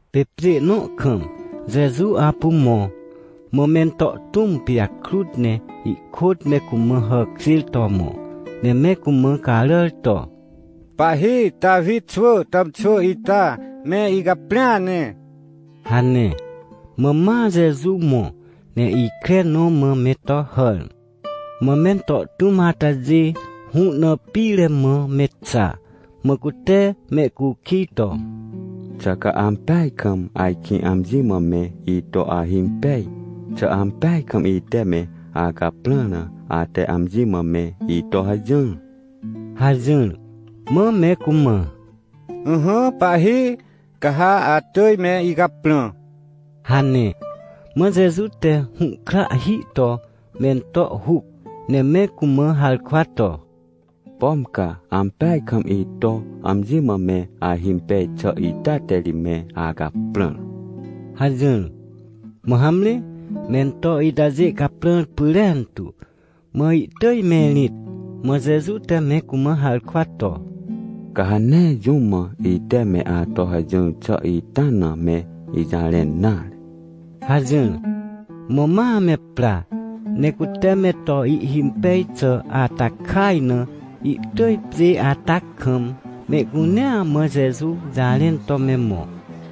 Pê pjê nõ kam Jeju apu mõ. Mã mento tũm pijakrut ne ihkôt me cumã hàkjêr to mõ, ne me cumã caràr to: — Pahhi Tawi xwỳ tàmxwỳ ita, me icaprĩa ne — hane. Mã ma Jeju mõ ne ikre nõ mã me to hàr, mã mento tũm atajê hũ na pire mã me xa. Mã cute mehcukij to: — Xà ca ampeaj kam ajkĩ amji mã me ito ahimpej? Xà ampeaj kam ite me acaprãr na ate amji mã me ito hajỹr? — hajỹr. Mã me cumã: — Ỹhỹ pahhi, ca ha atỳj me icaprã — hane. Mã Jeju te hũhkrahhi to mento huc, ne me cumã harkwa to: — Pom ca ampeaj kam ito amji mã me ahimpej xà ita te ri me acaprãr — hajỹr. Mã hamre, mento itajê caprãr pyrentu, mã ihtỳj me rĩt. Mã Jeju te me cumã harkwa to: — Ca ha nee jũm mã ite me ato hajỹr xà ita na me ijarẽn nare — hajỹr. Mã ma me pra, ne cute me to ihhimpej xà ata kaj na, ihtỳj pjê ata kam mehcunea mã Jeju jarẽn to me mõ.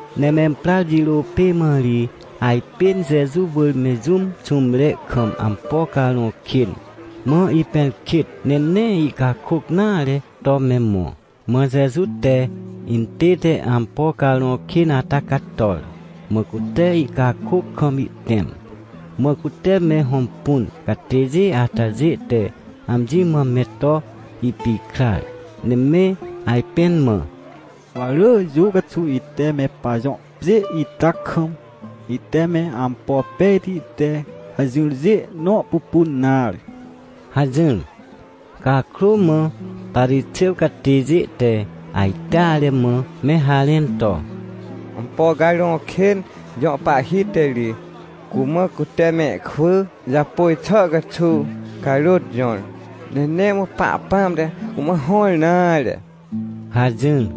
Ne memprar jirô pê mã ri ajpên Jeju wỳr me jũm xũmre kam ampo carõ kên, mã ipẽrkêt ne nee ihcakôc nare to me mõ. Mã Jeju te intête ampo carõ kên ata cator. Mã cute ihcakôc kam ihtẽm. Mã cute me hõmpun catêjê atajê te amji mã me to ipikrar, ne me ajpẽn mã: — Wa rỳ jũ caxuw ite me pajõ pjê ita kam, ite me ampo pejti te hajỹrjê nõ pupun nare — hajỹr. Cakrô mã Parixêw catêjê te ajteare mã me harẽn to: — Ampo carõ kên jõ pahhi te ri cumã cute mehkwỳ japôj xà caxuw carôt jõr, ne nee mã Pahpãm te cumã hõr nare — hajỹr.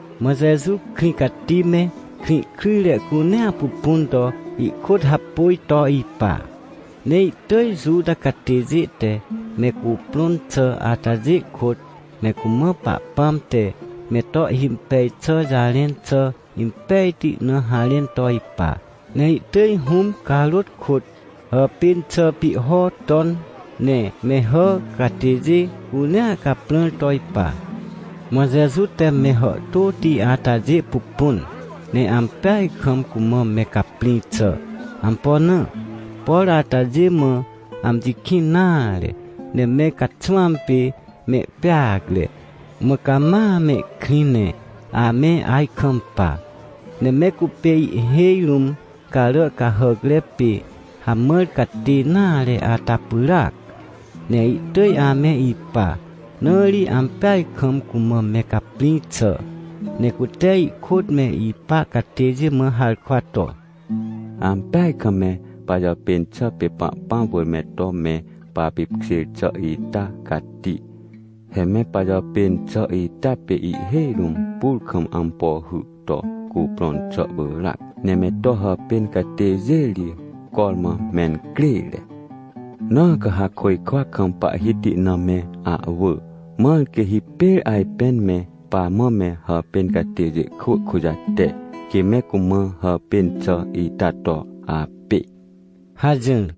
Mã Jeju krĩ cati me krĩ kryjre cunea pupun to ihkôt hapôj to ipa. Ne ihtỳj Juta catêjê te me cuprõn xà atajê kôt, me cumã Pahpãm te me to ihhimpej xà jarẽn xà impejti na harẽn to ipa. Ne ihtỳj Hũm carôt kôt hàpên xà pihho ton, ne me hà catêjê cunea caprãr to ipa. Mã Jeju te me hàhtôti atajê pupun, ne ampeaj kam cumã me caprĩ xà. Ampo na? Por atajê mã amji kĩn nare, ne me caxwãm pê mehpeacre, mã cama mehkrĩ ne ame ajkampa. Ne me cupê ihhêj rũm carà cahàcre pê hamãr catê nare ata pyràac, ne ihtỳj ame ipa, na ri ampeaj kam cumã me caprĩ xà. Ne cute ihkôt me ipa catêjê mã harkwa to: — Ampeaj kam me pajàpên xà pê Pahpãm wỳr me to me papipkjêr xà ita cati. He me pajàpên xà ita pê ihhêj rũm pur kam ampo hy to cuprõn xà pyràac. Ne me to hàpên catêjê ri cormã mencrêre. Na ca ha côjkwa kam Pahhiti na me ahwỳ, mãr quê hipêr ajpên me pamã me hàpên catêjê kwỳ kujate, quê me cumã hàpên xà ita to apê — hajỹr.